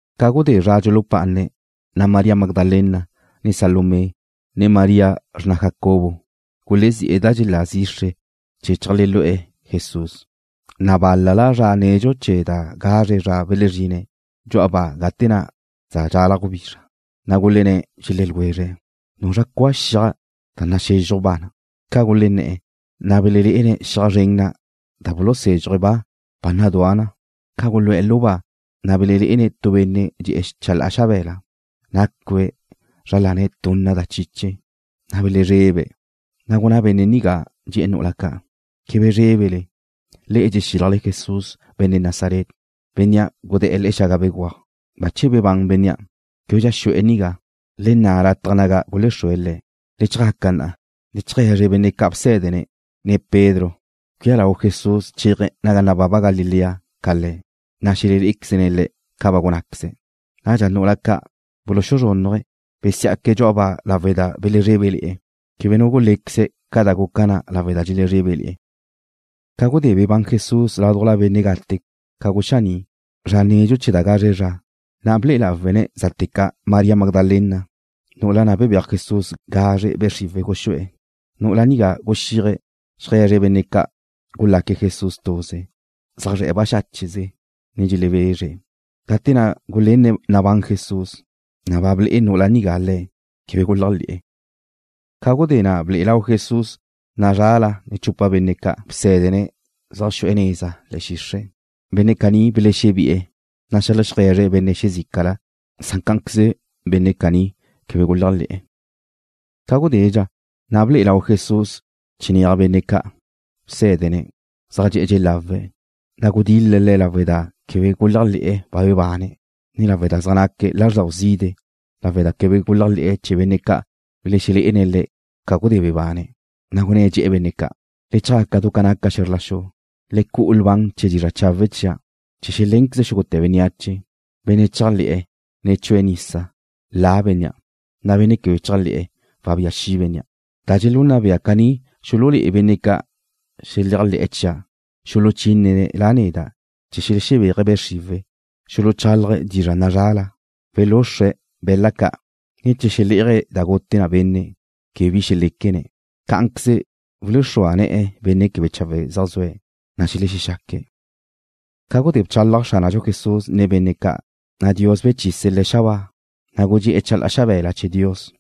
Ca gudé zra dxulupá'ane̱', na' María Magdalena, ne Salomé, ne María, xrna Jacobo, gulezí'e̱ da dxelá zixre chee̱ cheajlelu'e̱ Jesús. Na' bál-la'la zra nedxu chee̱ da gazre zra belezrine̱' dxu'a ba gate na' za dxalaj gubizra. Na' gulenné̱', dxelé̱' ljwezre̱': ―¿Nuzra cua xiaj da naxezxuj ba? Ca gulenné̱'e̱, na' belelé'ene̱' xiaj zren na' da bulusézxuje̱' ba, ba nadúa na. Ca gulu'e̱ lu ba, na' belelé'ene̱' tu benne' dxe'e̱ chalá'a xabe̱la, nácue̱' zra lane̱' tunna da chiche, na' belezrebe̱'. Na' gunná benne' nigá, dxe̱'e̱ nu'ula ca': ―Quebe zrébele. Le'e dxexílajle Jesús, benne' Nazaret, bénnea' gudé̱'e̱ le̱'e̱ xaga béguaj. Bache bebán bénnea'. Québedxa xu'e̱ nigá. Le nna' lataj naga gulexrúe̱' Le̱'. Le chjaca na'a, le cheaje̱zre benne' ca' bsé̱dene̱', ne Pedro cuía lau Jesús chéaje̱' naga nababa Galilea ca le'e. Na' xelé'equezle Le̱' ca ba gunnáqueze̱'. Nadxa nu'ula ca' buluzrúnnuje̱', besí'aque̱' dxu'a ba lawe' da belezrébele̱'e̱. Quebe nu gulé̱queze̱' ca da guca na lawe' da dxelezrébele̱'e̱. Ca gudé bebán Jesús ládujla benne' gate ca guxaní' zra nedxu chee̱ da gazre zra, na' ble'e lawe̱' zate ca' María Magdalena, nu'ula na' bebéaj Jesús gazre be' xriwe̱' guxú'e̱. Nu'ula nigá guxíaje̱' xeaje̱zre̱' benne' ca' gulaque̱' Jesús tuze, zaj zre̱'e̱ baxácheze, ne dxelebezre̱'. Gate na' gulenne̱' nabán Jesús, na' ba ble'e nu'ula nigá Le̱', quebe guléajle̱'e̱. Ca gudé na' ble'e lau Jesús nazrala chupa benne' ca' bsé̱dene̱' zaj xu'e̱ neza le̱'e̱ xixre'. Benne' caní belexebi'e̱, na' xeajlegue̱zre̱' benne' xezícala. Cá'anqueze benne' caní quebe guléajle̱'e̱. Ca gudédxa, na' ble'e lau Jesús chinéaj benne' ca' bsé̱dene̱' ca zaj dxe'e̱ dxelawe̱', na' gudil-le̱' le̱' lawe' da quebe guléajle̱'e̱ ba bebane̱', ne lawe' da zaj naque̱' lázrdau zide' lawe' da quebe guléajle̱'e̱ chee̱ benne' ca' belexelé'ene̱' Le̱' ca gudé bebane̱'. Na' gunné̱', dxe̱'e̱ benne' ca': ―Le chjaca du ca naca xe̱zr la xu. Le cu'u lban chee̱ dizra' chawe' chia' chee̱ xelénqueze xúgute̱ bénneache. Benne' chéajle̱'e̱, ne chue̱' nisa, la bénnea', na' benne' quebe chéajle̱'e̱, wabía xi' bénnea'. Da dxelunna bea caní xululé'e benne' ca' xeléajle̱'e̱ chia', xuluchínene̱' La neda' chee̱ xelexebéaje̱' be' xriwe̱'. Xuluchálaje̱' dizra' nazrala. Welúxrue̱' be̱la' ca', ne che xelé'aje̱' da gute benne', quebe bi xeléquene̱'. Cá'anqueze wuluxrúa ne̱'e̱ benne' quebe chawe' zaj zue̱', na' xelexexaque̱'. Ca gudé bchálaj Xránadxu Jesús nen benne' ca', na' Dios bechise̱' Le̱' xabáa, na' gudxé'e̱ chalá'a xabe̱la chee̱ Dios.